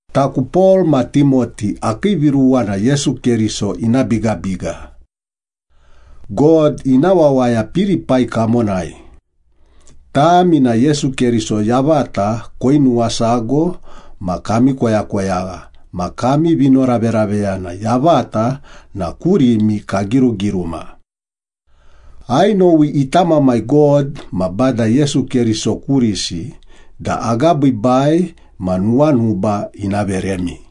Taku Pol ma Timoti akii viruwa na Yesu Keriso ina bigabiga. God ina wawaya Pilipai kamonai, tami na Yesu Keriso yavata koinuwasago ma kami koyakoyagha ma kami vinoraveraveyana yavata na kurimi kagirugiruma. Ainowi ita Mamai God ma Bada Yesu Keriso kurisi da agabiibai ma nuwanuba ina veremi.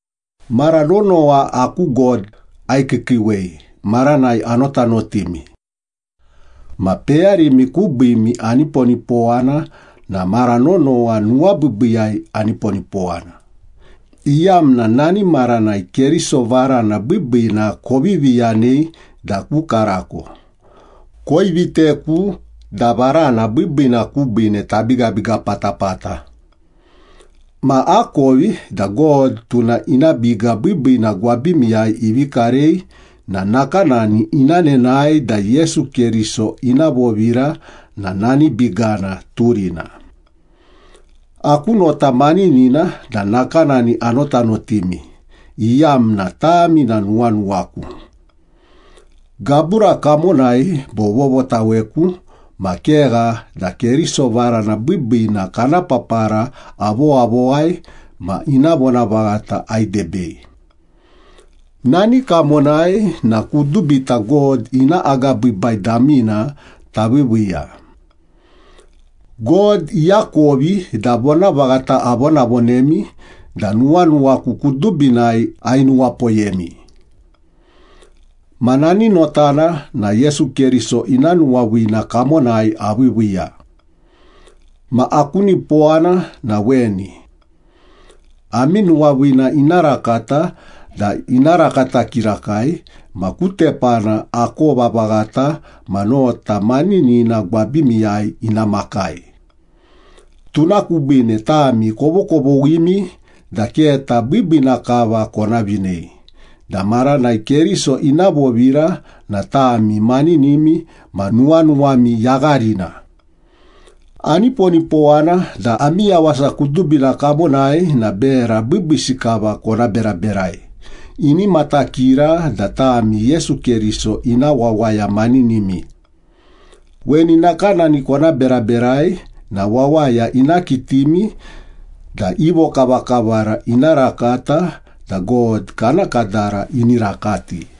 Mara nonowa aku God aikiikiiwei maranai anotanotimi. Ma peyarimi kubiimi aniponipowana na mara nonowa nuwabiibiiyai aniponipowana, iyamna nani maranai Keriso varana biibiina kovivi yanei da ku karako, koiviteku da varana biibiina kubiine tabigabiga patapata. Ma akovi da God, tuna ina biga biibiina gwabimiyai ivi karei na nakanani ina nenae da Yesu Keriso ina vovira na nani bigana turina. Aku nota maninina da nakanani anotanotimi, iyamna tami na nuwanuwaku. Gabura kamonai bo vovotaweku ma kegha da Keriso varana biibiina kana papara avowavowai ma ina vonavaghata aidebei. Nani kamonai na kudubita God ina agabiibai damina taviiviiya. God iakovi da vonavaghata avonavonemi da nuwanuwaku kudubinai ainuwapoyemi. Ma nani notana na Yesu Keriso ina nuwaviina kamonai aviiviiya. Ma aku nipowana na weni. Ami nuwaviina ina rakata da ina rakata kirakai, ma ku tepana akova vaghata ma nota maninina gwabimiyai ina makai. Tuna kubiine tami kovokovoghimi da keta biibiina kava kona vinei da maranai Keriso ina vovira na tami maninimi ma nuwanuwami yagharina. Aniponipowana da ami yawasa kudubina kamonai na bera biibiisi kava kona beraberai, ini matakira da tami Yesu Keriso ina wawaya maninimi. Weni nakanani kona beraberai na wawaya ina kitimi da i vokavakavara ina rakata da God kana kadara ini rakati.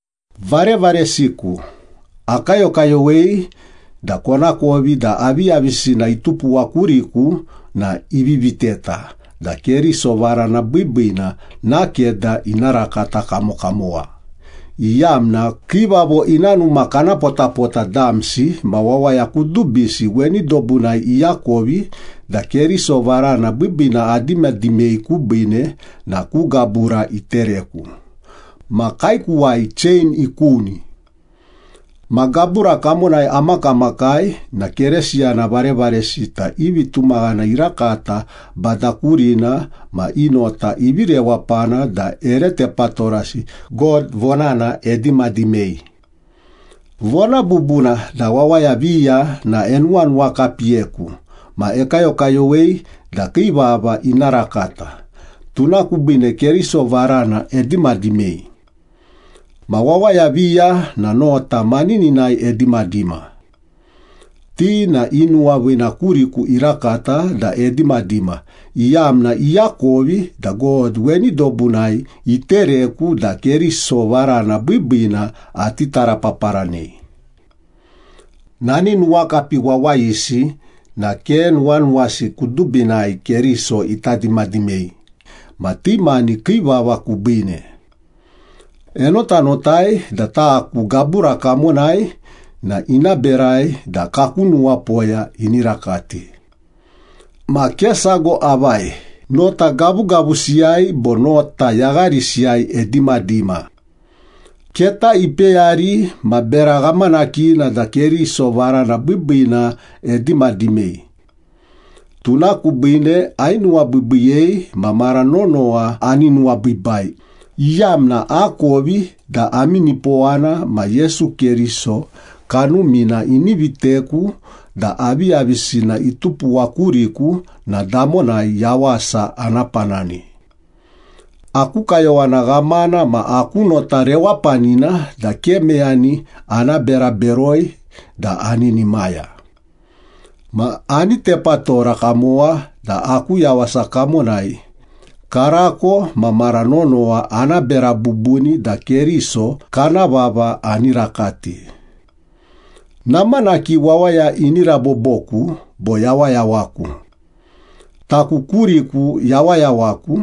Varevaresiku, akayokayowei da konakovi da aviyavisina itupuwa kuriku na ivi viteta da Keriso varana biibiina nakeda ina rakata kamokamowa, iyamna kiivavo ina numa kana potapota damsi ma wawaya kudubisi weni dobunai iakovi da Keriso varana biibiina adimadimei kubiine na ku gabura itereku ma kaekuwai chein ikuni. Ma gabura kamonai amakamakai na Keresiyana varevaresita i vitumaghana irakata Bada kurina ma i nota ivi rewapana da ere tepatorasi God vonana edimadimei. Vona bubuna da wawaya viya na enuwanuwakapiyeku ma ekayokayowei da kii vava ina rakata, tuna kubiine Keriso varana edimadimei. Ma wawaya viya na nota manininai edimadima. Ti na i nuwaviina kuriku irakata da edimadima, iyamna iakovi da God weni dobunai itereku da Keriso varana biibiina ati tarapaparanei. Nani nuwakapi wawayisi na ke nuwanuwasi kudubinai Keriso ita dimadimei ma ti mani kii vava kubiine. Enotanotai da taku gabura kamonai na ina berai da kaku nuwapoya ini rakati. Ma ke sago avai, nota gavugavusiyai bo nota yagharisiyai edimadima. Keta ipeyari ma bera ghamanakina da Keriso varana biibiina edimadimei. Tuna kubiine ainuwabiibiiyei ma mara nonowa ani nuwabiibai, iyamna akovi da ami nipowana ma Yesu Keriso Kanumina ini viteku da aviyavisina itupuwa kuriku na damonai yawasa ana panani. Aku kayowana ghamana ma aku nota rewapanina da ke meyani ana bera beroi da aninimaya. Ma ani tepatora kamowa da aku yawasa kamonai, karako ma mara nonowa ana bera bubuni da Keriso kana vava ani rakati. Namanaki wawaya ini raboboku bo yawayawaku. Taku kuriku yawayawaku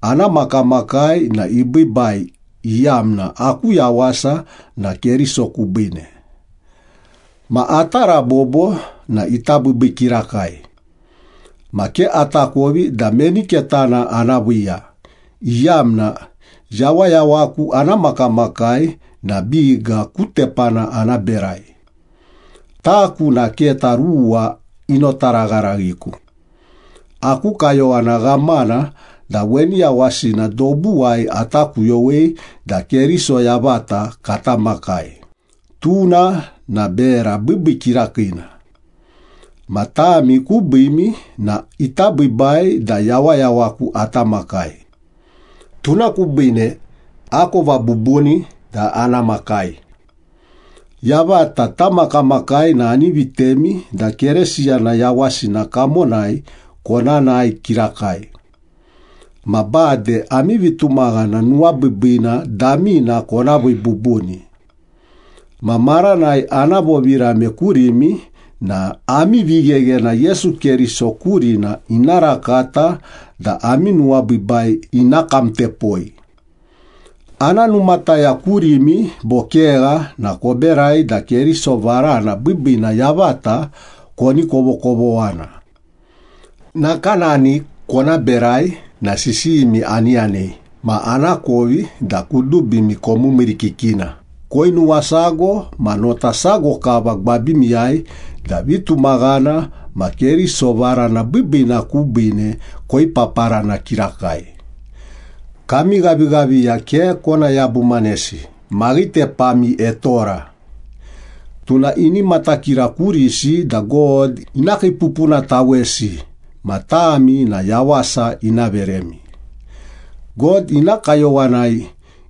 ana makamakai na ibiibai, iyamna aku yawasa na Keriso kubiine. Ma ata rabobo na ita biibii kirakai. Ma ke atakovi da meni ketana ana viiya, iyamna yawayawaku ana makamakai na biga ku tepana ana berai. Taku na keta ruwa inotaragharaghiku. Aku kayowana ghamana da weni yawasina dobuwai ata kuyowei da Keriso yavata kata makai, tuna na bera biibii kirakiina. Ma tami kubiimi na ita biibai da yawayawaku ata makai. Tuna kubiine, akova bubuni da ana makai. Yavata tamakamakai na ani vitemi da Keresiyana yawasina kamonai kona nae kirakai. Ma bade ami vitumaghana nuwabiibiina damina kona vii bubuni. Ma maranai ana vovirame kurimi na ami vigheghena Yesu Keriso kurina ina rakata da ami nuwabiibai ina kamtepoi. Ana numataya kurimi bo kegha na koberai da Keriso varana biibiina yavata koni kovokovoghana. Nakanani kona berai na sisiyimi ani yanei ma anakovi da kudubimi komiimiirikikina, koinuwasago ma nota sago kava gwabimiyai da vitumaghana ma Keriso varana biibiina kubiine koipaparana kirakai. Kami ghavighaviya ke kona yabumanesi, maghitepami etora. Tuna ini matakira kurisi da God ina kiipupunatawesi ma tami na yawasa ina veremi. God ina kayowanai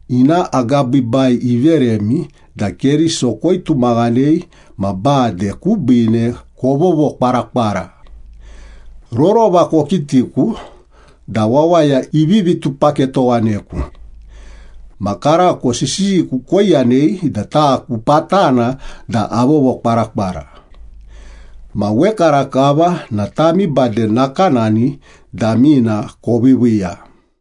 ina agabiibai iveremi da Keriso koitumaghanei ma bade kubiine kovovokwarakwara. Rorova kokitiku da wawaya ivivi tupaketowaneku. Ma karako sisiyiku koiyanei da taku patana da avovokwarakwara. Ma wekarakava na tami bade nakanani damina koviiviiya.